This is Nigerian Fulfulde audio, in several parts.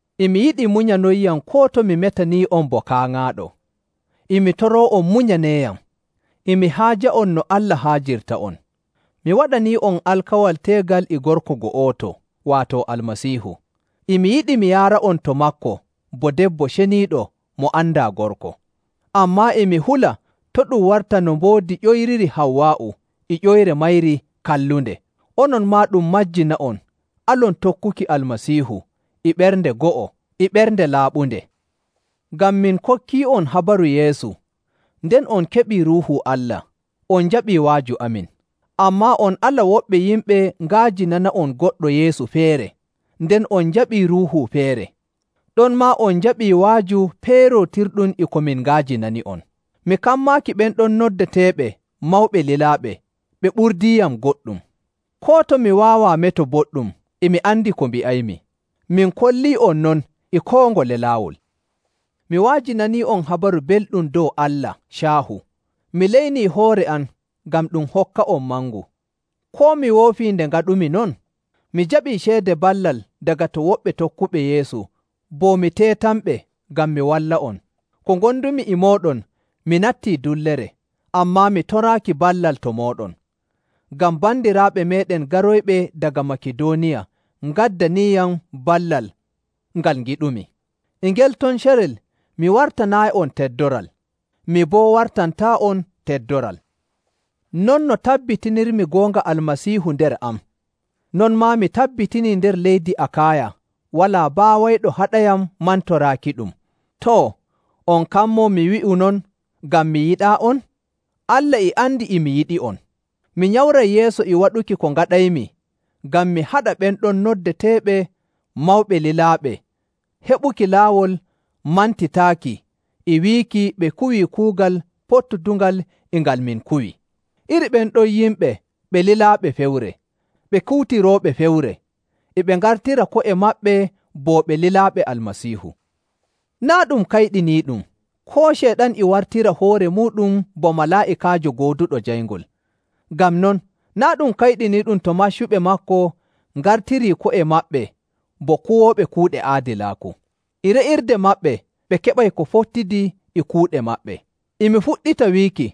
E mi yiɗi munyanonyam koo to mi metanii'on bo kaaŋaaɗo. E mi toroo'on munyaneeyam! E mi haaja'on no Allah haajirta'on. Mi waɗanii'on alkawal teegal e gorko go'oto, waato Almasiihu. E mi yiɗi mi yaara'on to maako bo debbo ceniiɗo mo andaa gorko. Ammaa e mi hula to ɗum warta no mboodi ƴoyriri Hawwaa'u e ƴoyre mayri kallunde, onon maa ɗum majjina'on alon tokkuki Almasiihu e ɓernde go'o e ɓernde laaɓunde. Ngam min kokkii'on habaru Yeesu, nden on keɓii Ruuhu Allah, on njaɓii wa'aju amin. Ammaa on ala woɓɓe yimɓe nga'ajinana'on goɗɗo Yeesu feere, nden on njaɓii ruuhu feere, ɗonmaa on njaɓii wa'aju peerootirɗum e ko min nga'ajinani'on. Mi kammaaki ɓen ɗon noddeteeɓe “mawɓe lilaaɓe” ɓe ɓurdiiyam goɗɗum. Koo to mi waawaa meto boɗɗum, e mi andi ko mbi'aymi. Min kollii'on non e koo ngole laawol. Mi wa'ajinanii'on Habaru Belɗum dow Allah caahu. Mi leynii hoore am ngam ɗum hokka'on mangu. Koo mi woofii nde ngaɗumi non? Mi jaɓii ceede ballal daga to woɓɓe tokkuɓe Yeesu bo mi teetanɓe ngam mi walla'on. Ko ngondumi e mooɗon mi nattii dullere, ammaa mi toraaki ballal to mooɗon, ngam bandiraaɓe meeɗen garoyɓe daga Makidooniya ngaddaniiyam ballal ngal ngiɗumi. E ngel ton carel mi wartanaayi'on teddoral, mi boo wartantaa'on teddoral. Non no tabbitinirmi goonga Almasiihu nder am, non maa mi tabbitinii nder leydi Akaaya walaa baawayɗo haɗayam mantoraakiɗum. Too, on kammoo mi wi'u non ngam mi yiɗaa'on? Allah e andi e mi yiɗi'on! Mi nyamray yeeso e waɗuki ko ngaɗaymi ngam mi haɗa ɓen ɗon noddeteeɓe “mawɓe lilaaɓe” heɓuki laawol mantitaaki e wiiki ɓe kuwii kuugal pottudungal e ngal min kuwi. Iri ɓen ɗon yimɓe ɓe lilaaɓe fewre, ɓe kuutirooɓe fewre, e ɓe ngartira ko'e maɓɓe bo ɓe lilaaɓe Almasiihu. Naa' ɗum kayɗiniiɗum! Koo Ceyɗan e wartira hoore muuɗum bo malaa'ikaajo gooduɗo jayngol. Ngam non, naa' ɗum kayɗiniiɗum to maccuɓe maako ngartirii ko'e maɓɓe bo kuwooɓe kuuɗe aadilaaku. E re'irde maɓɓe ɓe keɓay ko fottidi e kuuɗe maɓɓe. E mi fuɗɗita wiiki,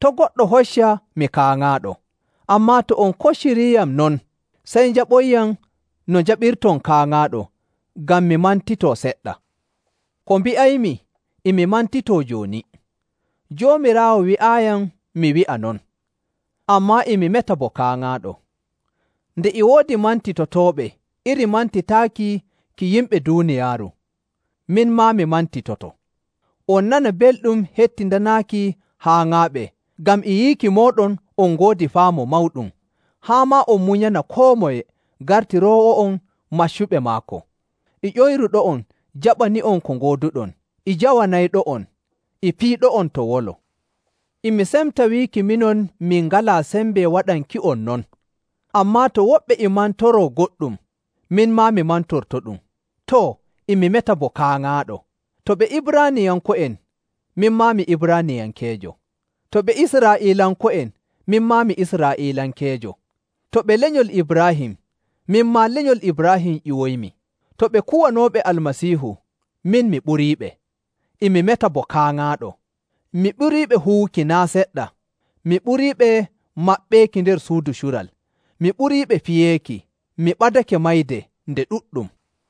to' goɗɗo hocca mi kaaŋaaɗo. Ammaa to on kocciriiyam non, sey njaɓonyam no njaɓirton kaaŋaaɗo ngam mi mantitoo seɗɗa. Ko mbi'aymi e mi mantitoo jooni, Joomiraawo wi'aayiyam mi wi'a non, ammaa e mi meta bo kaaŋaaɗo. Nde e woodi mantitotooɓe iri mantitaaki ki yimɓe duuniyaaru, min maa mi mantitoto. On nana belɗum hettindanaaki haaŋaaɓe ngam e yiiki mooɗon on ngoodi faamu mawɗum! Haa maa on munyana koo moye gartiroowo'on maccuɓe maako, e ƴoyruɗo'on jaɓani'on ko ngooduɗon, e jawanayɗo'on, e piiɗo'on to wolo. E mi semta wiiki minon min ngalaa sembe waɗanki'on non! Ammaa to woɓɓe e mantoroo goɗɗum, min maa mi mantortoɗum. Too, e mi meta bo kaaŋaaɗo! To ɓe Ibraaniyanko'en, min maa mi Ibraaniyankeejo. To ɓe Israa'iilanko'en, min maa mi Israa'iilankeejo. To ɓe lenyol Ibraahim, min maa lenyol Ibraahim ƴiwoyimi. To ɓe kuwanooɓe Almasiihu, min mi ɓuriiɓe. E mi meta bo kaaŋaaɗo! Mi ɓuriiɓe huwuki naa' seɗɗa, mi ɓuriiɓe maɓɓeeki nder suudu cural, mi ɓuriiɓe fiyeeki, mi ɓadake mayde nde ɗuɗɗum.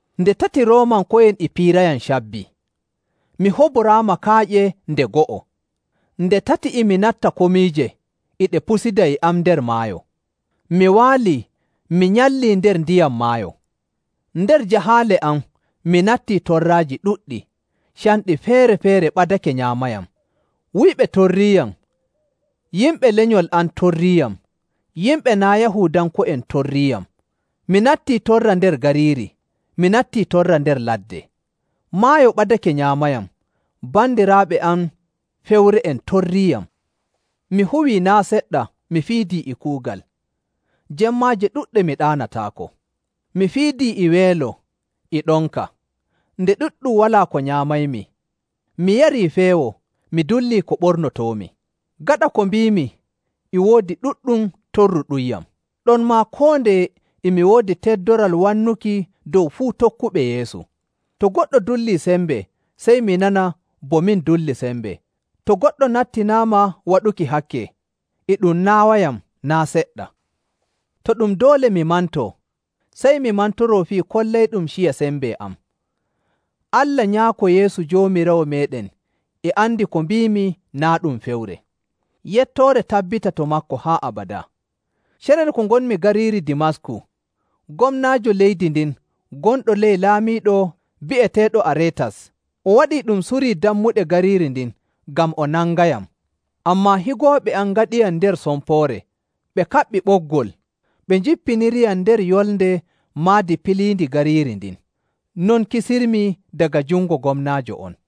Nde tati Roomanko'en e piirayam cabbi. Mi huboraama kaaƴe nde go'o. Nde tati e mi natta komiije e ɗe pusida e am nder maayo, mi waalii mi nyallii nder ndiyam maayo. Nder jahaale am mi nattii torraaji ɗuɗɗi, canɗi feere‑feere ɓadake nyaamayam, wuyɓe torriiyam, yimɓe lenyol am torriiyam, yimɓe naa' Yahuudanko'en torriiyam. Mi nattii torra nder gariiri, mi nattii torra nder ladde, maayo ɓadake nyaamayam, bandiraaɓe am fewre'en torriiyam. Mi huwii naa' seɗɗa mi fiidii e kuugal, jemmaaje ɗuɗɗe mi ɗaanataako. Mi fiidii e weelo e ɗonka, nde ɗuɗɗum walaa ko nyaamaymi, mi yarii feewo, mi dullii ko ɓornotoomi. Gaɗa ko mbiimi, e woodi ɗuɗɗum torruɗumyam, ɗonmaa koo ndeye e mi woodi teddoral wannuki dow fuu tokkuɓe Yeesu. To goɗɗo dullii sembe, sey mi nana bo min dulli sembe. To goɗɗo nattinaama waɗuki hakke, e ɗum naawayam naa' seɗɗa. To ɗum doole mi mantoo, sey mi mantoroo fii kollayɗum ciya sembe am. Allah Nyaako Yeesu Joomiraawo meeɗen e andi ko mbiimi naa' ɗum fewre. Yettoore tabbita to maako haa abadaa. Carel ko ngonmi gariiri Dimasku, gomnaajo leydi ndin gonɗo ley laamiiɗo bi'eteeɗo Areetas, o waɗii ɗum suri dammuɗe gariiri ndin ngam o nangayam. Ammaa higooɓe am ngaɗiyam nder sompoore, ɓe kaɓɓi ɓoggol, ɓe njippiniriyam nder yolnde maadi piliindi gariiri ndin. Non kisirmi daga jungo gomnaajo on.